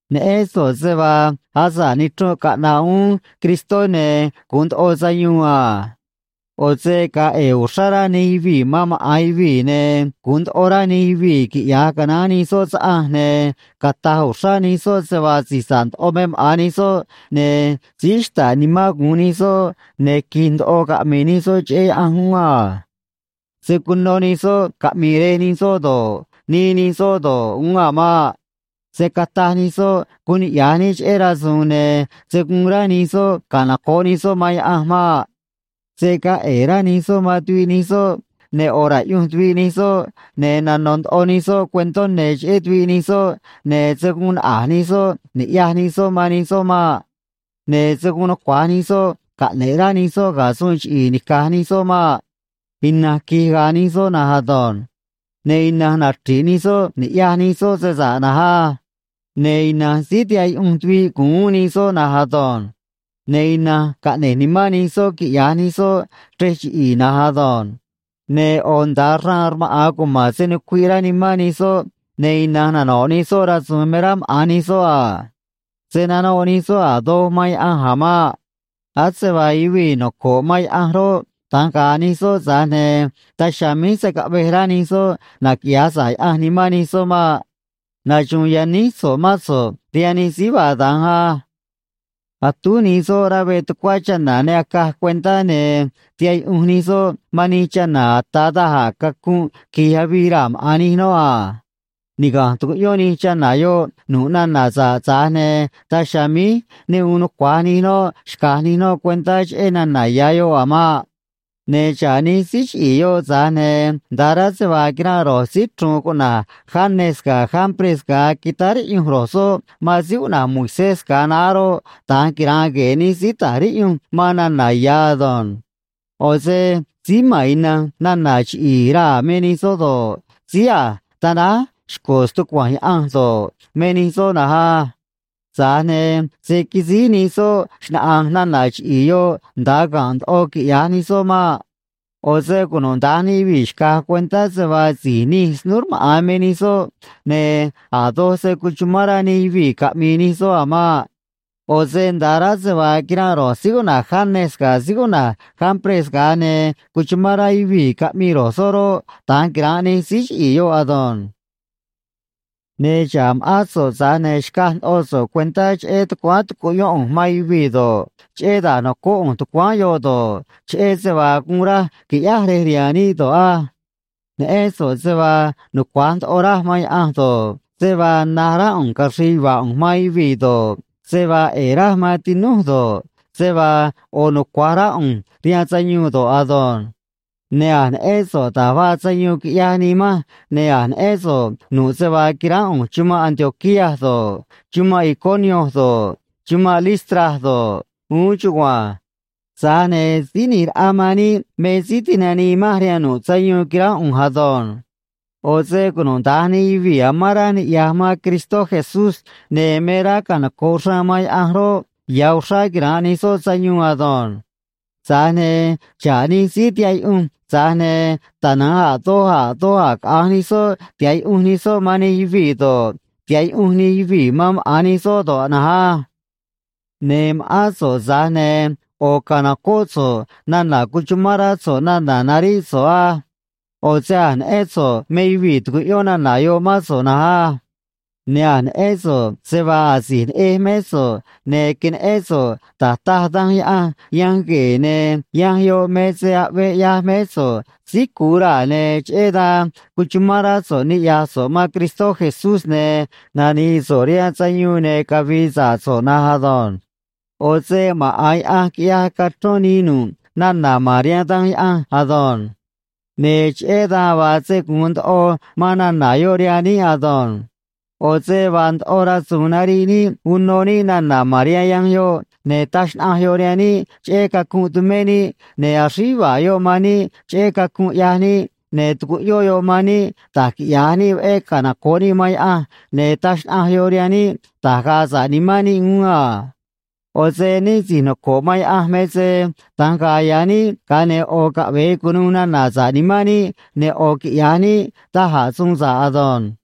Neꞌén so̱ꞌ se vaa asa̱ꞌ nichrunꞌ caꞌna̱ꞌ uún Cristó, ne̱ gu̱un ndoꞌo sayuun a. ꞌO̱ se ga̱a̱ ꞌe̱e̱ uxrá rá nij yuvii̱ man maꞌa̱n yuvii̱, ne̱ gu̱un ndoꞌo rá nij yuvii̱ quiꞌya̱j canaán nij soꞌ saꞌanj, ne̱ cata̱j uxrá nij soꞌ se vaa si̱j sa̱ꞌ ndoꞌo me maꞌa̱n nij soꞌ, ne̱ síí xta̱ꞌ nimán gu̱un nij soꞌ, ne̱ qui̱j ndoꞌo caꞌmi̱i̱ nij soꞌ cheꞌé Yaꞌanj uún a. Se̱ cuno nij soꞌ caꞌmi̱i̱ rej nij soꞌ do̱ꞌ, nii nij soꞌ do̱ꞌ, uún a̱ maꞌ. Se̱ cataj nij soꞌ guun niꞌya̱j níꞌ cheꞌé rasu̱u̱n, ne̱ se̱ guun rá nij soꞌ canoco̱ꞌ nij soꞌ man Yaꞌanj maꞌ. Se̱ gaa ꞌe̱e̱ rá nij soꞌ man tuviꞌ nij soꞌ, ne̱ ꞌo̱ ra̱ꞌyunj tuviꞌ nij soꞌ, ne̱ nano̱ ndoꞌo nij soꞌ cuentó ne̱ cheꞌé tuviꞌ nij soꞌ, ne̱ se̱ guun naꞌa̱j nij soꞌ ni̱ꞌyaj nij soꞌ man nij soꞌ maꞌ. Ne̱ se̱ guun nucua̱j nij soꞌ caꞌne̱ꞌ rá nij soꞌ ga̱ suun chiꞌi̱i̱ nica̱j nij soꞌ maꞌ. Ina̱nj qui̱j ga̱a̱ nij soꞌ na̱nj ado̱nj. Ne̱ ina̱nj nachri̱ꞌ nij soꞌ ni̱ꞌyaj nij soꞌ se sa̱ꞌ na̱nj á. Ne̱ ina̱nj síí tihaꞌ yuꞌunj tuviꞌ gu̱un uún nij soꞌ na̱nj ado̱nj. Ne̱ ina̱nj caꞌne̱j nimán nij soꞌ quiꞌya̱j nij soꞌ chrej chiꞌi̱i̱ na̱nj ado̱nj. Ne̱ ꞌo̱ nda̱a xraan rmaꞌa̱n cuma̱n se nucuiꞌ rá nimán nij soꞌ, ne̱ ina̱nj nano̱ꞌ nij soꞌ rasu̱u̱n me rá maꞌa̱n nij soꞌ a. Se̱ nanoꞌ nij soꞌ a̱ doj man Yaꞌanj a̱ maꞌ. Ase vaa yuvii̱ noco̱ꞌ man Yaꞌanj roꞌ, da̱nj ga̱a̱ nij soꞌ, tza̱j ne̱ daj chiha̱a̱ míj se̱ caꞌvej rá nij soꞌ naquiꞌya̱j sa̱ꞌ Yaꞌanj nimán nij soꞌ maꞌ. Naxu̱u̱n yaníj so̱ꞌ mán so̱ꞌ rihaan nij síí vaa da̱nj á. Atúj nij soꞌ rá veꞌ tucuá chana̱ ne acaj cuentá, ne̱ tihaꞌ yuꞌunj nij soꞌ man nij chana̱ ata̱ da̱j a̱ cacunꞌ qui̱j avii raa̱ maꞌa̱n nij noꞌ a. Niga̱nj tucuꞌyón nij chana̱ yoꞌ nu̱ꞌ nana̱ sa̱ꞌ, tza̱j ne̱ daj chiha̱a̱ míj ne gu̱un nucua̱j nij noꞌ xca̱j nij noꞌ cuentá cheꞌé nana̱ ya̱ yoꞌ a̱ maꞌ. Ne̱ xa̱ꞌ nij síí chiꞌi̱i̱ yoꞌ, tza̱j ne̱ nda̱ꞌ rá se vaa quiranꞌ ro̱j síí chru̱u̱n cuꞌna̱j Janes ga̱ Jambres ga̱a quitáá riꞌyunj ro̱j soꞌ man síí cuꞌna̱j Moisés ga̱a naá roꞌ, da̱nj quira̱nꞌ gue̱e̱ nij síí ta̱j riꞌyunj man nana̱ ya̱ ado̱nj. ꞌO̱ se síí ma̱n ina̱nj nana̱ chiꞌi̱i̱ raa̱ me nij soꞌ do̱ꞌ, síí a̱j tanáj xco̱ stucua̱nj Yaꞌanj do̱ꞌ, me nij soꞌ na̱nj á. Tza̱j ne̱ se̱ quisíj nij soꞌ xnaꞌa̱nj nana̱ chiꞌi̱i̱ yoꞌ nda̱a ga̱nꞌ ndoꞌo quiꞌya̱j nij soꞌ maꞌ. ꞌO̱ se cunuda̱nj nij yuvii̱ xca̱j cuentá se vaa si̱j nij snúú rmaꞌa̱n me nij soꞌ, ne̱ a̱ doj se̱ cuchumán rá nij yuvii̱ caꞌmi̱i̱ nij soꞌ a̱ maꞌ. ꞌO̱ se nda̱ꞌ rá se vaa quiranꞌ ro̱j síí cuꞌna̱j Janes ga̱ síí cuꞌna̱j Jambres ga̱a ne cuchuma̱n rá yuvii̱ caꞌmii ro̱j soꞌ roꞌ, da̱nj quira̱nꞌ nij síí chiꞌi̱i̱ yoꞌ ado̱nj. Ne̱ xa̱ꞌ ma̱ꞌán so̱ꞌ, tza̱j ne̱ xcaj ndoꞌo so̱ꞌ cuentá cheꞌé tucuáán tucuꞌyón ꞌu̱nj man yuvii̱ do̱ꞌ, cheꞌé da̱j nocóꞌ ꞌu̱nj tucuáán yoꞌ do̱ꞌ, cheꞌé se vaa guun raj qui̱ꞌyáj rej rihaan níꞌ do̱ꞌ á. Neꞌén so̱ꞌ se vaa nucua̱j ndoꞌo raj man Yaꞌanj do̱ꞌ, se vaa na̱j rá ꞌu̱nj caxri̱i̱ yuva̱a̱ ꞌu̱nj man yuvii̱ do̱ꞌ, se vaa ꞌe̱e̱ raj man tinúj do̱ꞌ, se vaa ꞌo̱ nucua̱j rá ꞌu̱nj rihaan sayuun do̱ꞌ ado̱nj. Ne̱ a̱j neꞌén so̱ꞌ da̱j vaa sayuun quiꞌyaj nii manj, ne̱ a̱j neꞌén so̱ꞌ nu̱ꞌ se vaa quiránꞌ ꞌu̱nj chumanꞌ Antioquía do̱ꞌ, chumanꞌ Iconio do̱ꞌ, chumanꞌ Listra do̱ꞌ, uún chugua̱nj. Tza̱j ne̱ Síí ꞌNi̱j Raꞌa man níꞌ me síí tinanii manj rihaan nu̱ꞌ sayuun quiránꞌ ꞌu̱nj ado̱nj. ꞌO̱ se cunuda̱nj nij yuvii̱ amán rá niꞌya̱j man Cristó Jesús ne̱ me rá canoco̱ꞌ xraan man Yaꞌanj roꞌ, ya̱ uxrá quira̱nꞌ nij soꞌ sayuun ado̱nj. Tza̱j ne̱ xa̱ꞌ nij síí tihaꞌ yuꞌunj, tza̱j ne̱ tana̱nj a̱ doj a̱ doj a̱ caꞌa̱nj nij soꞌ tiha̱ꞌ yuꞌunj nij soꞌ man nij yuvii̱ do̱ꞌ, tiha̱ꞌ yuꞌunj nij yuvii̱ man maꞌa̱n nij soꞌ do̱ꞌ na̱nj á. Ne̱ ma̱ꞌán so̱ꞌ, tza̱j ne̱ ꞌo̱ ca̱nocóꞌ so̱ꞌ nana̱ cuchumán rá so̱ꞌ nana̱ naríꞌ so̱ꞌ á. ꞌO̱ se a̱j neꞌén so̱ꞌ me yuvii̱ tucuꞌyón nana̱ yoꞌ mán so̱ꞌ na̱nj á. Ne̱ a̱j neꞌén so̱ꞌ se vaa asi̱j neꞌej mé so̱ꞌ, ne̱ queneꞌén so̱ꞌ da̱j taj Danj Yaꞌanj Yanj Gue̱e̱, ne̱ yanj yoꞌ me se aꞌvee ꞌyaj mé so̱ꞌ síí cu̱u raa̱, ne̱ cheꞌé dan cuchumán rá so̱ꞌ niꞌya̱j so̱ꞌ man Cristó Jesús, ne̱ nani̱i̱ so̱ꞌ rihaan sayuun ne̱ cavi̱i̱ sa̱ꞌ so̱ꞌ na̱nj ado̱nj. ꞌO̱ se maꞌa̱n Yaꞌanj quiꞌyaj cachrón nii nu̱ꞌ nana̱ ma̱n rihaan Danj Yaꞌanj ado̱nj. Ne̱ cheꞌé dan vaa se gu̱un ndoꞌo man nana̱ yoꞌ rihaan níꞌ ado̱nj. ꞌO̱ se vaa ndoꞌo rasu̱u̱n nariꞌ níꞌ uno níꞌ nana̱ ma̱n rihaan yanj yoꞌ, ne̱ taj xnaꞌanj yoꞌ rihaan níꞌ cheꞌé cacunꞌ tumé níꞌ, ne̱ axríj yuva̱a̱ yoꞌ man níꞌ cheꞌé cacunꞌ ꞌyaj níꞌ, ne̱ tucuꞌyón yoꞌ man níꞌ da̱j quiꞌya̱j níꞌ veꞌé canoco̱ꞌ níꞌ man Yaꞌanj, ne̱ taj xnaꞌanj yoꞌ rihaan níꞌ da̱j ga̱a̱ sa̱ꞌ nimán níꞌ uún a. ꞌO̱ se níꞌ si̱j noco̱ꞌ man Yaꞌanj me se da̱nj ga̱a̱ ya̱ níꞌ, ga̱a ne̱ ꞌo̱ caꞌve̱e cu̱nuû nana̱ sa̱ꞌ nimán níꞌ, ne̱ ꞌo̱ quiꞌya̱j níꞌ da̱j a̱ suun sa̱ꞌ ado̱nj.